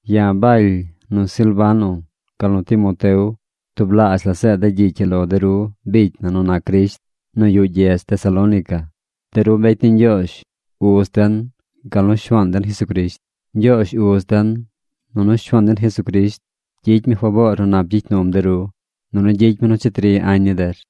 Ya̱ Baly, nu Silvano, gal nu Timoteo tublaazh la zeed de̱ gyicy ii lo de ru bicy na nu nac Crisht nu yuꞌ gyedz Tesalónica. De ru mbecy ni Ñgyoozh, Uz den, gal nu Shuaan den Jesucrisht. Ñgyoozh Uz den nunu Shuaan den Jesucrisht gyicy mi faboor nu nap gyicy num de ru, nunu gyicy mi nu cheti ri añ ni der.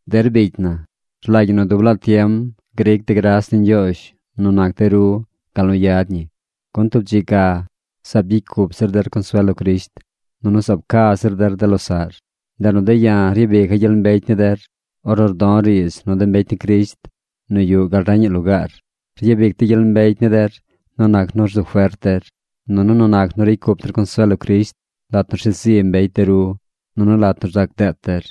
Der bicy na, rlagy ñi nu dub laa tiem gric de̱ gras ni Ñgyoozh nu nac de ru gal nu yad ñi, gun tub dzi ga zaab gyicy cup zir der consuel lo Crisht, nunu zaab ca zir der de losaꞌr. Ndeꞌ nu de̱ ya̱ ryabica̱ gyel mbecy ni der ornu rdo̱ riidz nu de mbecy ni Crisht nu yuꞌ gal reñaꞌ lugaar. Ryabic de̱ gyel mbecy ni der nu nac nu rzu fert der, nunu nu nac nu ricy cup der consuel lo Crisht lat nu rshet zi mbecy de ru nunu lat nu rzac deet der.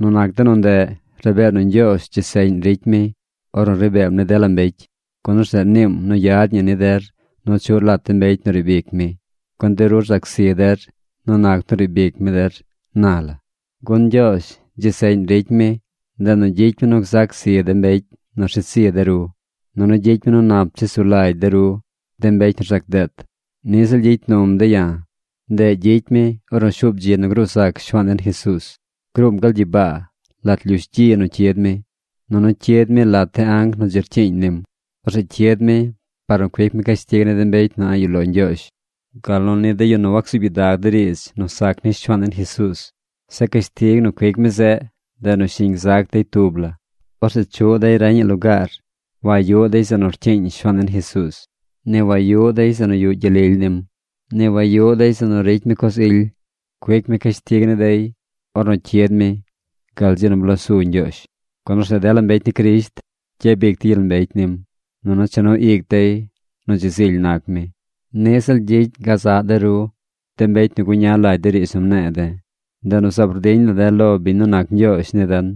Nu nac de nu ndeꞌ, rabee nu Ñgyoozh dzi seꞌñ ricy mi ornu ri beem ni dela mbecy, gun orzeꞌ niim nu yad ñi ni der nu chuꞌr lat de mbecy nu riib ic mi, gun de ru rzac zi der nu nac nu riib ic mi der naa la. Gun Ñgyoozh dzi seꞌñ ricy mi. Ndeꞌ nu gyicy mi nu gzac zi de mbecy nu rshet zi de ru, nunu gyicy mi nu nap chesu nap lagy de ru, de mbecy nu rzac deet. Niꞌ ziꞌl gyicy num de̱ ya̱. Ndeꞌ gyicy mi ornu shuub dzi nu gruu zac Shuaan den Jesuuz. Gruum gal gyibaa lat lyush gyi nu cyid mi. Nunu cyid mi lat de anc nu dzi rcyiiñ nim. Orzeꞌ cyid mi par nu cuic mi cashtig ni de mbecy nu a̱ꞌ yuꞌ lo Ñgyoozh, gal nu ni de yu nu wacsuub gyidag de riidz nu sac ni Shuaan den Jesuuz. Zeꞌ cashtig nu cuic mi zeꞌ, ndeꞌ nu shiñ gzac dey tub la. Orzeꞌ chuꞌ dey reñaꞌ lugaar. Wayuꞌ dey zeꞌ nu rcyiiñ Shuaan den Jesuuz. Ni wayuꞌ dey zeꞌ nu yuꞌ gyel lily nim. Ni wayuꞌ dey zeꞌ nu ricy mi coz ily. Cuic mi cashtig ni dey ornu cyid mi gal dzi nu blosu Ñgyoozh. Gun orzeꞌ dela mbecy ni Crisht gyabic dey gyel mbecy nim, nunu cha nu ic dey nu dzi zily nac mi. Niꞌ ziꞌl gyicy gazaꞌ de ru, de mbecy nu guña lagy de riidz nu mne̱e̱ de̱. Ndeꞌ nu zaab rdiñ la̱ de̱ lo biñ nu nac Ñgyoozh ni den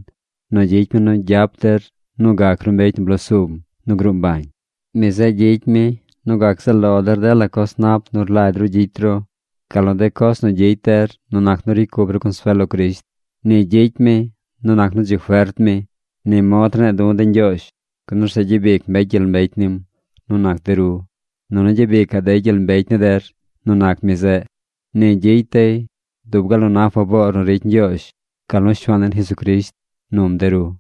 nu gyicy mi nu gyap der nu gac ru mbecy nu blosum nu gruu mbañ. Mi zeꞌ gyicy mi nu gac zaꞌ lo der dela coz nap nu rlagy ru gyicy ru, gal nu de coz nu gyicy der nu nac nu ricy cup ru consuel lo Crisht. Ni gyicy mi nu nac nu dzi fert mi. Ni mod rne̱e̱ du̱ de̱ Ñgyoozh, gun orzeꞌ gyabic mbecy gyel mbecy nim nu nac de ru, nunu gyabicaꞌ dey gyel mbecy ni der nu nac mi zeꞌ. Ni gyicy dey dub gal nu na faboor nu ricy Ñgyoozh gal nu Shuaan den Jesucrisht num de ru.